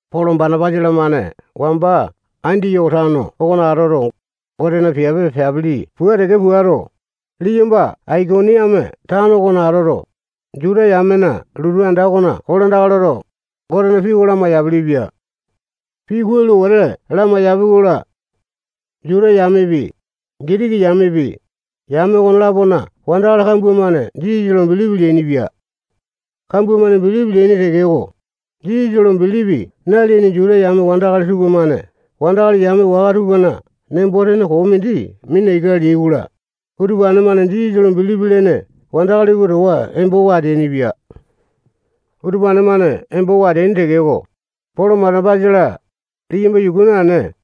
Polo, Banapasa-lamane wamba Andiyoko tano okona atoto, Gotena piape peapili pua teke puato, liyamba Aikoniame tano okona atoto, Juta yamena lotu anda okona kolandaka loto, Gotena pii oko lamai-yapilipia. Pii kuai lo wete lamaiyapi-kola, Juta yamepi, Gitiki yamepi, yame okone-lapona wandakali kambua-mane Jisasa lo bilipi leainipia. Kambua-mane bilipi leaini tekeko, Jisasa lo bilipi naleaini Juta yame wandakali tupamane wandakali yame waka tupana nembo-tene koo mindi mina ika leai-kola, utupane-mane Jisasa lo bilipi lene wandakali tupa towa embowa ateainipia. Utupane-mane embowa ateaini tekeko, Polo, Banapasa-la, liyamba yuku naene,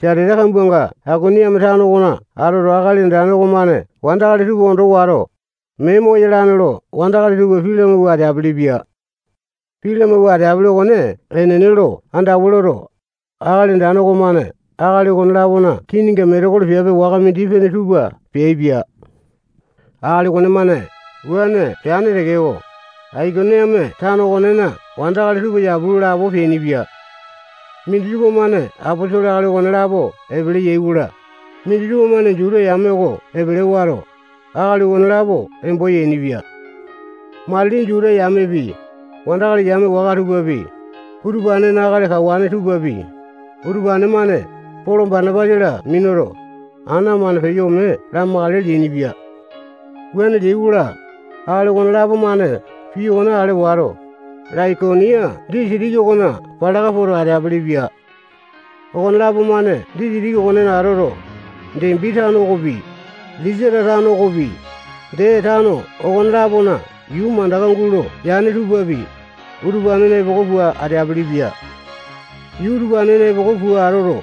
satete kambuanga Aikoniame tano okona atoto, Akali Andane okomane wandakali tupa ondo wato, mee moyalane lo wandakali tupa pii lamawua ateapili-pia. Pii lamawua ateapele okone enene lo andawa loto, Akali Andane okomane akali okone-lapona kininga metekolo piape waka mindi-pene tupa peaipia. Akali okonemane wuane peane tekeko, Aikoniame tano okonena wandakali tupa yapu lo lapo peainipia. Minditupa-mane aposolo akali okonelapo epele yai-kola, minditupa-mane Juta yame oko epele wato, akali okonelapo embo yainipia. Matili Juta yamepi, wandakali yame waka tupapi, utupanena akali kawane tupapi, utupane-mane Polo, Banapasa-la minuto, ana-mane peyo ome lamakale leainipia. Wuane leai-kola, akali okonelapo-mane pii okone ale wato, Laikonia disitiki okona palaka poto, ateapili-pia. Okonelapo-mane disitiki okonena atoto, Depi tano okopi, Lisata tano okopi, dee tano okone-lapona yuu mandaka gulo yane tupapi, utupanena epoko pua ateapili-pia. Yuu utupanena epoko pua atoto,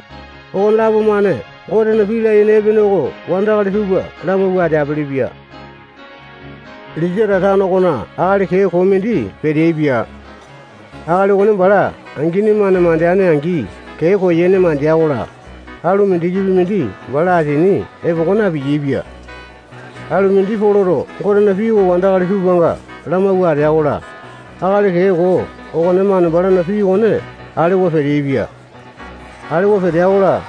okonelapo-mane Gotena pii layene epene oko wandakali tupa lamawua ateapili-pia. Lisata tano okona akali kee koo mindi peteaipia. Akali okone bala angini-mane mandeane-angi kee koyene mandea-kola, alu mindikipi mindi bala asini epoko na-piyaepia. Alu mindi Poloto Gotena pii oko wandakali tupanga lamawua atea-kola, akali kee koo okonemane balana pii okone alewa peteaipia. Alewa petea-kola,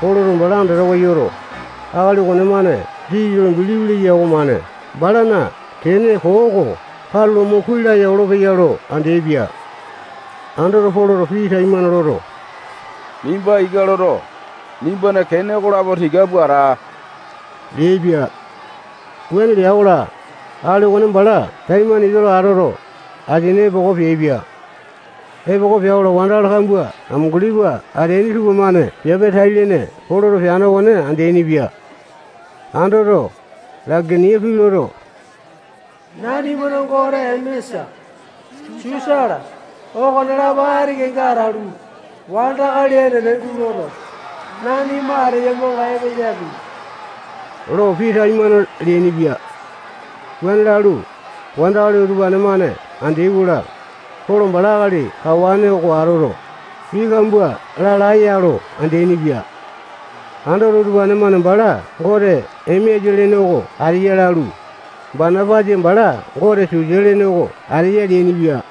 Poloto bala andatawa yoto, akali okonemane Jisasa lo bilipi leya okomane balana kene koo oko katulo mo kuai laya olopeya lo andeaipia. Andoto, Poloto pii taimane loto, nimba ika loto, nimbana kene okolapo tika pua ata leaipia. Wuane lea-kola, akali okone bala taimane ika lo atoto, asini epoko peaipia. Epoko pea-kola, wandakali kambua amunguli pua ateaini tupamane piape tai-lene Poloto peane okone andeainipia. Andoto, Laikonia pii loto, nanimana gote Emesa, Susa-la, okonelapo ati kenga atalu, wandakali enene guloto, nanima ateyamanga epeyapi lo pii taimane leainipia. Wuane lalu, wandakali utupane-mane andeai-kola, Polo bala akali kawane oko atoto, pii kambua lalae-ya lo andeaini-pia. Andoto, utupane-mane bala gote Emesa lene oko ateya lalu, Banapasa bala gote Susa lene oko ateya leainipia.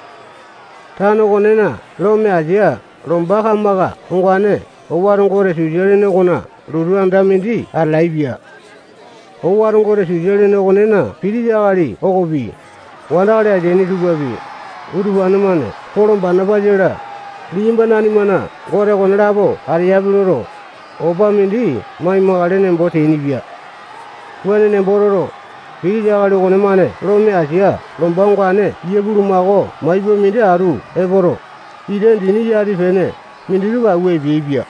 Tano okonena lome asia lomba kamaka ongane owato gote Susa lene okona lotu anda mindi atalaepia. Owato gote Susa lene okonena pitisa akali okopi, wandakali ateaini tupapi, utupane-mane Polo, Banapasa-la, liyamba nanimana gote okonelapo ateyapi loto, opa mindi maimakale nembo teainipia. Wuane nembo toto, pitisa akali okonemane lome asia lomba ongane yia bulumako maipa minditupa atu epoto, ita dini yati-pene minditupa awua epeaipia.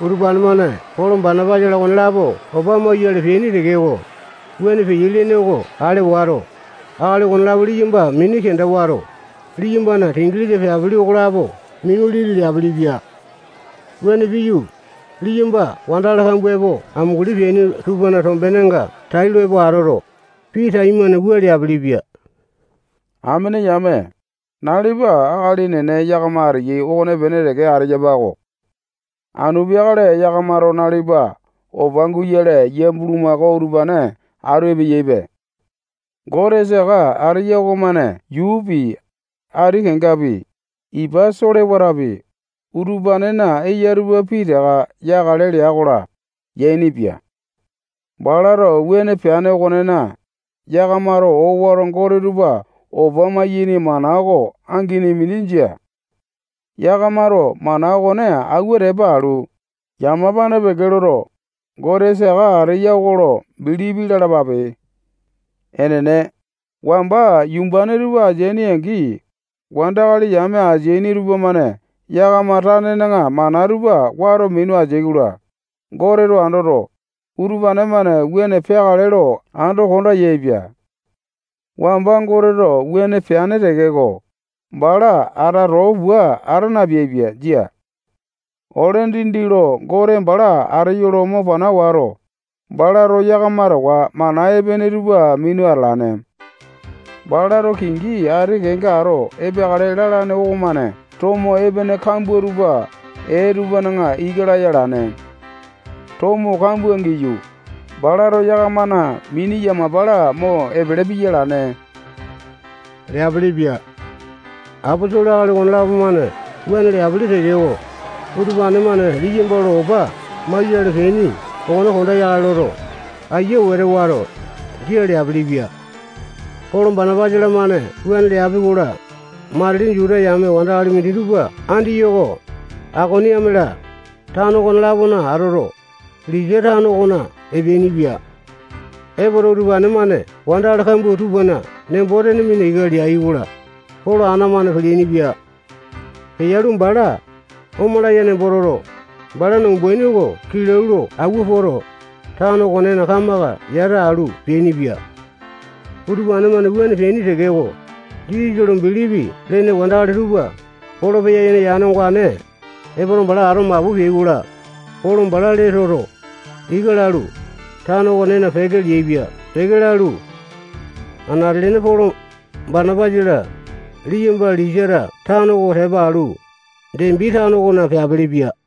Utupane-mane Polo, Banapasa-la, okonelapo opa mauyale epeaini tekeko, wuane peyai lene oko ale wato, akali okonelapo liyamba mini kenda wato, liyambana singilisa peapili okolapo minu liti leapilipia. Wuane piyu, liyamba wandakali kambua epo amunguli peaini tupana tombenenga tailo epo atoto, pii taimane wua leapilipia. Amene yame, nalipa akali enene yakama ateyai okonepene teke ateyapa-ko. Anu peakale yakamato nalipa opa guyale yia bulumako utupane atu epeyaipe. Gote saka ateya okomane yuupi, ati kengapi, ipa solewatapi, utupanena eya tupa pitaka yakale lea-kola, yainipia. Balato wuane peane okonena, yakamato owato gote tupa opa maiyaini mana oko angini mindi jia. Yakamato mana okone awua tepa alu, yamapane peke loto, Gote saka ateya oko lo bilipi lalapape. Enene, wamba yumbane tupa ateaini-angi, wandakali yame ateaini tupamane yakama tanena mana tupa wato minu ateai-kola, Goteto andoto, utupane-mane wuane peakale lo ando konda yaepia. Wamba Goteto wuane peane tekeko, bala ata too pua ata napeaipia. Jia. Ole dindi lo Gote bala ateyo lo mo pana wato, balato yakama towa mana epene tupa minu atalane. Balato kingi ati kenga ato epeakale lalane okomane tomo epene kambua tupa ee tupana ika laya alane. Tomo kambua giyu, balato yakamana mini yamapa-la mo epele piya alane leapilipia. Aposolo akali okonelapo-mane wuane leapili tekeko, utupane-mane liyamba lo opa mawuayale peaini okone konda yakale loto, aiya wete wato, jia leapilipia. Polo, Banapasa-lamane wuane leapi-kola, matili Juta yame wandakali minditupa Andiyoko, Aikoniame-la, tano okone-lapona atoto, Lisata tano okona epeainipia. Epoto, utupane-mane wandakali kambua tupana nembo-tene mina ika leai-kola, Polo ana-mane peleaini-pia. Peyalu, bala omalaya nembo toto, balana umbaini oko kilau lo awua poto, tano okonena kamaka yata alu peainipia. Utupane-mane wuane peaini tekeko, Jisasa lo bilipi lene wandakali tupa Polo peya-yene yane ongane epoto, bala ato mapu peai-kola, Polo bala lee toto, ika lalu, tano okonena peke leaipia. Peke lalu, anate-lene Polo, Banapasa-la, liyamba Lisata tano oko tepa alu, Depi tano okona peapilipia.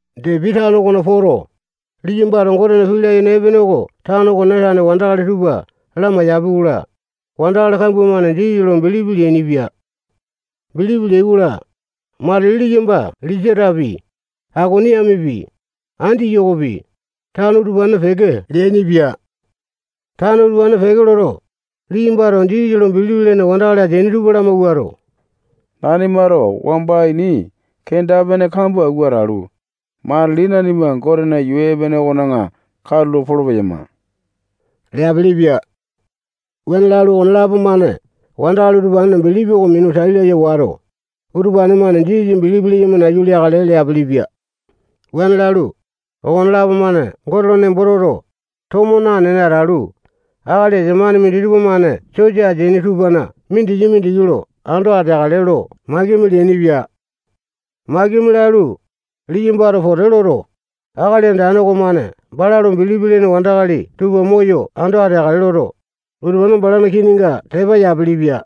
Depi tano okona poto, liyambato Gotena pii layene epene oko tano okonena tane wandakali tupa lamaiyapi-kola, wandakali kambua-mane Jisasa lo bilipi leainipia. Bilipi leai-kola, matili liyamba Lisatapi, Aikoniamepi, Andiyokopi, tano utupanena peke leainipia. Tano utupanena peke loto, liyambato Jisasa lo bilipi lene wandakali ateaini tupa lamawuato, nanimato wamba ini kenda-pene kambua awua atalu, matili nanima Gotena yuu epene okona katulo polo-peyama leapilipia. Wuane lalu, okonelapo-mane wandakali utupanena bilipi oko minu tai laya wato, utupane-mane Jisasa bilipi leyama nayu leakale leapilipia. Wuane lalu, okonelapo-mane Gote lo nembo toto, tomo nanene atalu, akali esamane minditupa-mane sosa ateaini tupana mindiki-mindiki lo ando ateakale lo makimi leainipia. Makimi lalu, liyambato pote loto, Akali Andane okomane bala lo bilipi lene wandakali tupa moyo ando ateakale loto, utupane balana kininga tepa yapilipia.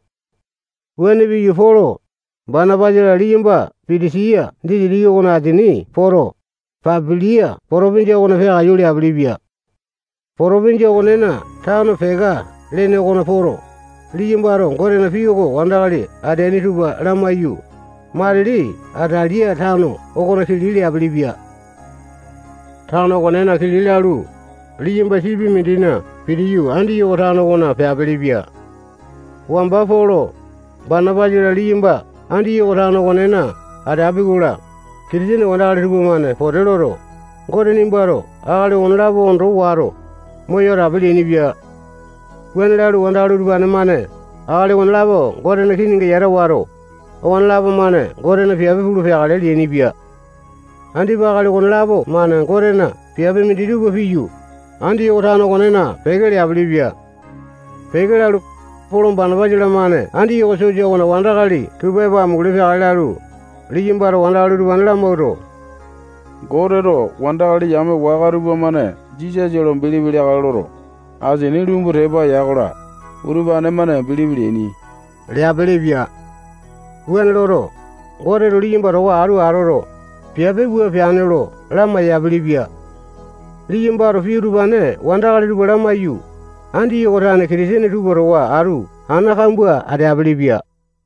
Wuane piyu, Polo, Banapasa-la, liyamba Pisitiya disitiki okona asini poto, Pambilia potopinjia okona peakaiyu leapilipia. Potopinjia okonena tano Peka lene okona poto, liyambato Gotena pii oko wandakali ateaini tupa lamaiyu, matili Atalia tano okona kili leapilipia. Tano okonena kili lalu, liyamba sipi mindina pitiyu, Andiyoko tano okona peapilipia. Wamba Polo, Banapasa-la, liyamba Andiyoko tano okonena ateapi-kola, Kitisene wandakali tupamane pote loto, Gote nimbato akali okolapo ondo wato, moyo atape leainipia. Wuane lalu, wandakali utupane-mane akali okonelapo Gotena kininga yata wato, okonelapo-mane Gotena piape pulu peakale leainipia. Andipa akali okonelapo-mane Gotena piape minditupa piyu, Andiyoko tano okonena peke leapilipia. Peke lalu, Polo, Banapasa-lamane Andiyoko sosa okona wandakali tupa epo amunguli peakale lalu, liyambato wandakali utupane lamawuato, Goteto wandakali yame waka tupamane Jisasa lo bilipi leakale loto, asini lumbu tepa ya-kola, utupane-mane bilipi leaini leapilipia. Wuane loto, Goteto liyamba towa atu atoto, piape wua peane lo lamai-yapilipia. Liyambato pii utupane wandakali tupa lamaiyu, Andiyoko tane Kitisene tupa towa atu ana kambua ateapili-pia.